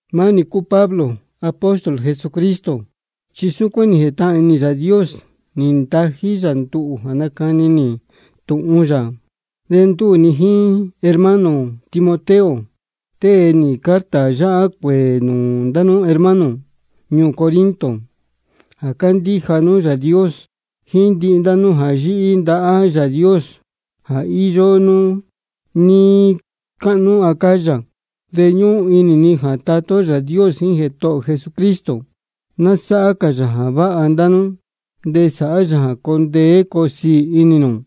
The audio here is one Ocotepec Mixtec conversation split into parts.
Maá nī cúu Pablo, apóstol Jesucristo, chi súcuán nī jētahān inī Yāā Dios nī ntají yā nduhū jā nacani nī tūhun yā. De ndúū ni jíín hermano ō Timoteo tée nī carta yáhá cuēē nūū ndá nú hermano ñuū Corinto jā cándíja nú Yāā Dios, jíín nūū ndihi ndá nú jā yíhí ndahá Yāā Dios jā íyó nú níí cáhnú Acaya. De ñúhún inī ni jā Tatá ó Yāā Dios jíín Jētohō ō Jesucristo ná sáhá cā yā jā váha ndá nú de sāhá yā jā coo ndeé coo siī inī nū.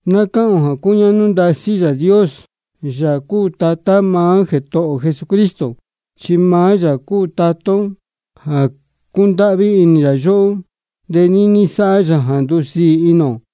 Ná cáhān ō jā cúñáhnú ndasí Yāā Dios, Yāā cúu Tatá maá Jētohō ō Jesucristo. Chi maá yā cúu Tatá ó jā cúndáhví inī yóhó, de níní sáhá yā jā ndúsiī inī ō.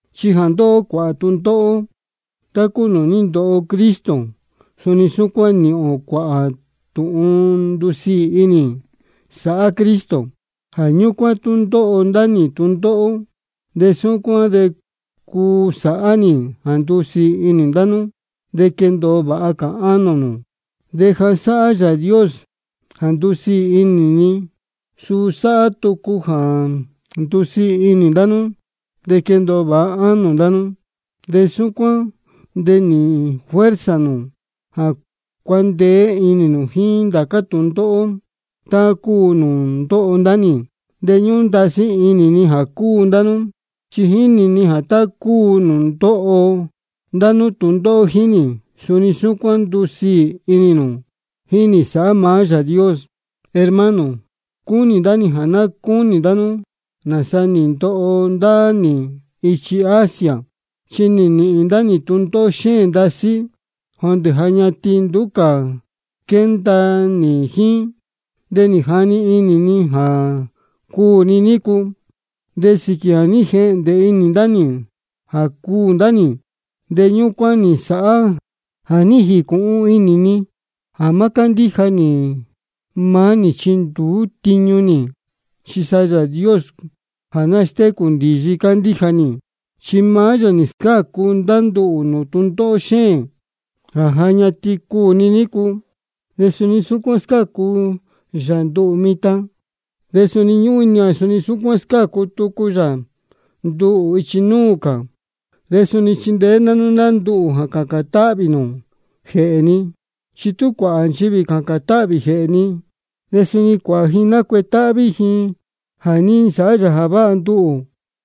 Chi jā ndóho ó cuāhā tūndóhó tá cúu nūū ní ndoho Cristo, suni súcuán níhīn ō cuāhā tūhun ndusiī inī, sáhá Cristo. Jā ñúcuán, tú ndóho ndá nī tūndóhó, de súcuán de cúu sáhá nī jā ndusiī inī ndá nú de quendōo vāha cā ánō nū. De jā sáhá Yāā Dios jā ndúsiī inī ni, suu sáhá tucu jā ndusiī inī ndá nú, de quendōo vāha cā ánō nū. De súcuán de nīhīn nū fuerza jā cuandeé inī nū jíín ndācá tūndóhó tá cúu nūū ndóho ndá nī. De ñúhún ndasí inī ni jā cúu ndá nú, chi jínī ni jā tá cúu nūū ndóho ndá nú tūndóhó jíín nī, suni súcuán ndusiī inī nū jíín nī sāhá maá Yāā Dios. Hermano, cúnī ndá nī jā ná cúnī ndá nú nāsa nī ndoho ndá nī ichi Asia. Chi nī nīhīn ndá nī tūndóhó xéēn ndasí, jondē ja ñatin nduú cā quénda nī jíín, de nī jani inī ni jā cuū ni nícu. De sīquī jā ní jehndē inī ndá nī jā cuū ndá nī, de ñúcuán nī nsāhá jā ní jīcūhun inī ni jā má cándíja nī maá nī chi nduú tiñu nī, chi sa Yāā Dios jā nástécū ndīyi candíja nī. Chi maá yā nī scácu ndá nduhū nūū tūndóhó xéēn jā ja ñatin cuū ni nícu, de suni súcuán scácu yā nduhū mitan. De ñúhún inī ni jā suni scácu tucu yā nduhū ichi núū cā. De suni chindeé ndá nú ndá nduhū jā cācān táhvī nū jēhē ni. Chi tú cuāhā nchivī cācān táhvī jēhē ni, de suni cuāhā ji cuu nacuetáhví jēhē ni jā ní nsāhá yā jā váha nduhū.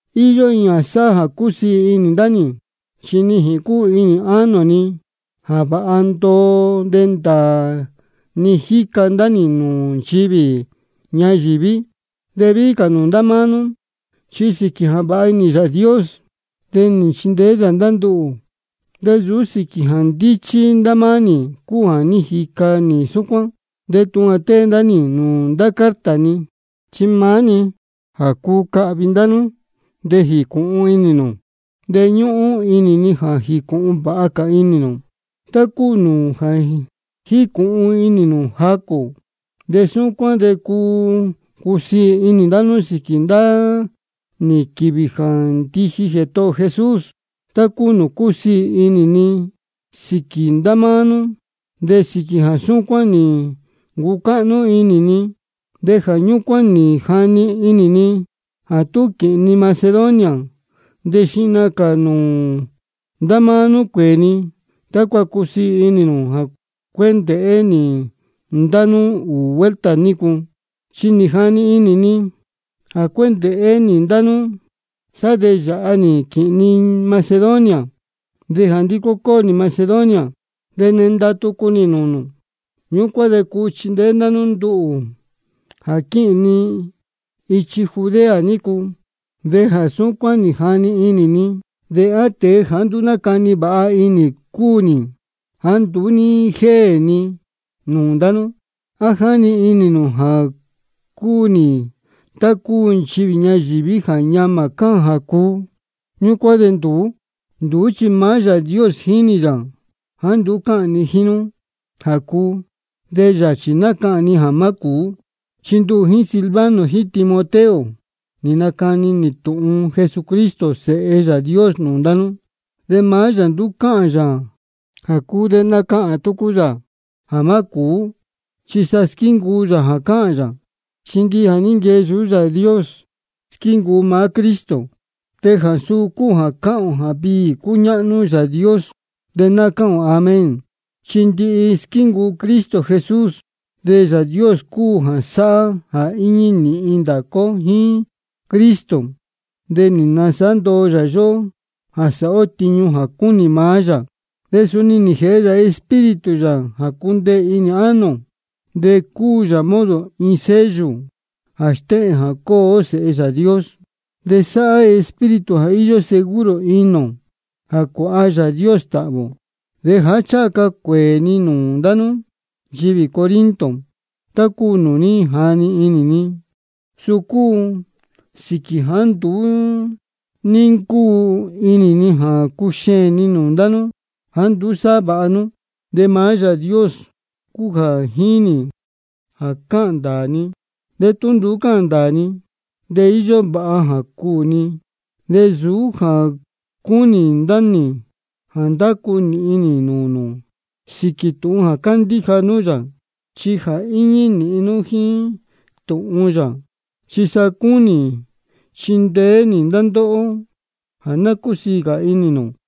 Iyó iin jā sáhá jā cúsiī inī ndá nī: Chi nijīn cúu inī ánō ni jā vāha ndoo de ndāā nī jica ndá nī nūū nchivī ñayīví, de víhí cā nūū ndá máá nú. Chi sīquī jā váha inī Yāā Dios, de nī nchindeé yā ndá nduhū, de nsūú sīquī jā ndíchí ndá máá nī cúu jā ní jica nī súcuán. De tūhun jā tée ndá nī nūū ndācá carta ni, chi maá-ni jā cuu cahvi ndá nú de jīcūhun inī nū cúu. De ñúhún inī ni jā jīcūhun vāha cā inī nū, tá cúu nūū ja jícūhun inī nū jacū. De súcuán de cuu cusiī inī ndá nú sīquī ndá nī quīvī jā ndiji Jētohō ō Jesús, tá cúu nūū cúsiī inī ni sīquī ndá máá nú. De sīquī jā súcuán nī ncucáhnú inī ni, de jā ñúcuán nī jani inī ni jā tá quīhīn ni Macedonia de xihna cā nūū ndá máá nú cuēē ni, tácua cusiī inī nū jā cuéndēhé nī ndá nú ūū vuelta nícu. Chi nī jani inī ni jā cuéndēhé nī ndá nú, sá de yāha nī quīhīn ni Macedonia, de jā ndicó nī Macedonia de nenda tucu nī nūū nū. Ñúcuán de cuu chindeé ndá nú nduhū jā quíhīn ni ichi Judea nícu. De jā súcuán nī jani inī ni, ¿de á tēe jāá nduú nácani vāha inī cúu nī jāá nduú ní jéē ni nūū ndá nú? ¿A jáni inī nū jā cúu nī tá cúu nchivī ñayīví jā ñamā cáhān jā cuu, ñúcuán de nduú? Nduú chi maá Yāā Dios jínī yā jāá nduú cáhān ni jíín nú jā cuu, de yachī nácahān ni jā má cūú. Chi nduhū jíín Silvano jíín Timoteo nī nacani nī tūhun Jesucristo Sēhe Yāā Dios nūū ndá nú. De maá yā nduú cáhān yā jā cuu de nacahān tucu yā jā má cūú. Chi sa squíncuu yā jā cáhān yā. Chi ndihi jā ní nquee yuhú Yāā Dios, squíncuu maá Cristo. De jā suu cúu jā cáhān ō jā viī cúñáhnú Yāā Dios, de cáhān ō Amén, chi ndihi squíncuu Cristo Jesús. De Yāā Dios cúu jā sáhá jā íñí nīhin ndācá ó jíín Cristo, de nī nsāhá ndoo yā yóhó jā sāhá ó tiñu jā cúnī yā. De suni nī jēhe yā Espíritu yā jā cundeē inī ánō ō, de cúu yā modo iin sello jā stéhēn jā cúu ó sēhe Yāā Dios. De sáhá Espíritu jā íyó seguro inī ō jā cuāha Yāā Dios tāhvī ō. De jāá ncháha ca cuēē ni nūū ndá nú nchivī Corinto, tá cúu nūū ní jani inī ni, suu cúu sīquī jāá nduú ní ncúu inī ni jā cuxeēn ni nūū ndá nú jāá nduú sáhá vāha nú. De maá Yāā Dios cúu jā jínī jā cáhān ndāā ni. De tú nduú cáhān ndāā ni, de íyó vāha jā cuū ni. De nsūú jā cúnī ndá nī jā ndacu nīhin nī nūū nū sīquī tūhun jā cándíja nú yā, chi ja íñí nīhin nú jíín tūhun yā. Chi sa cúnī ni chindeé nī ndá ndóhó jā ná cúsiī cā inī nū.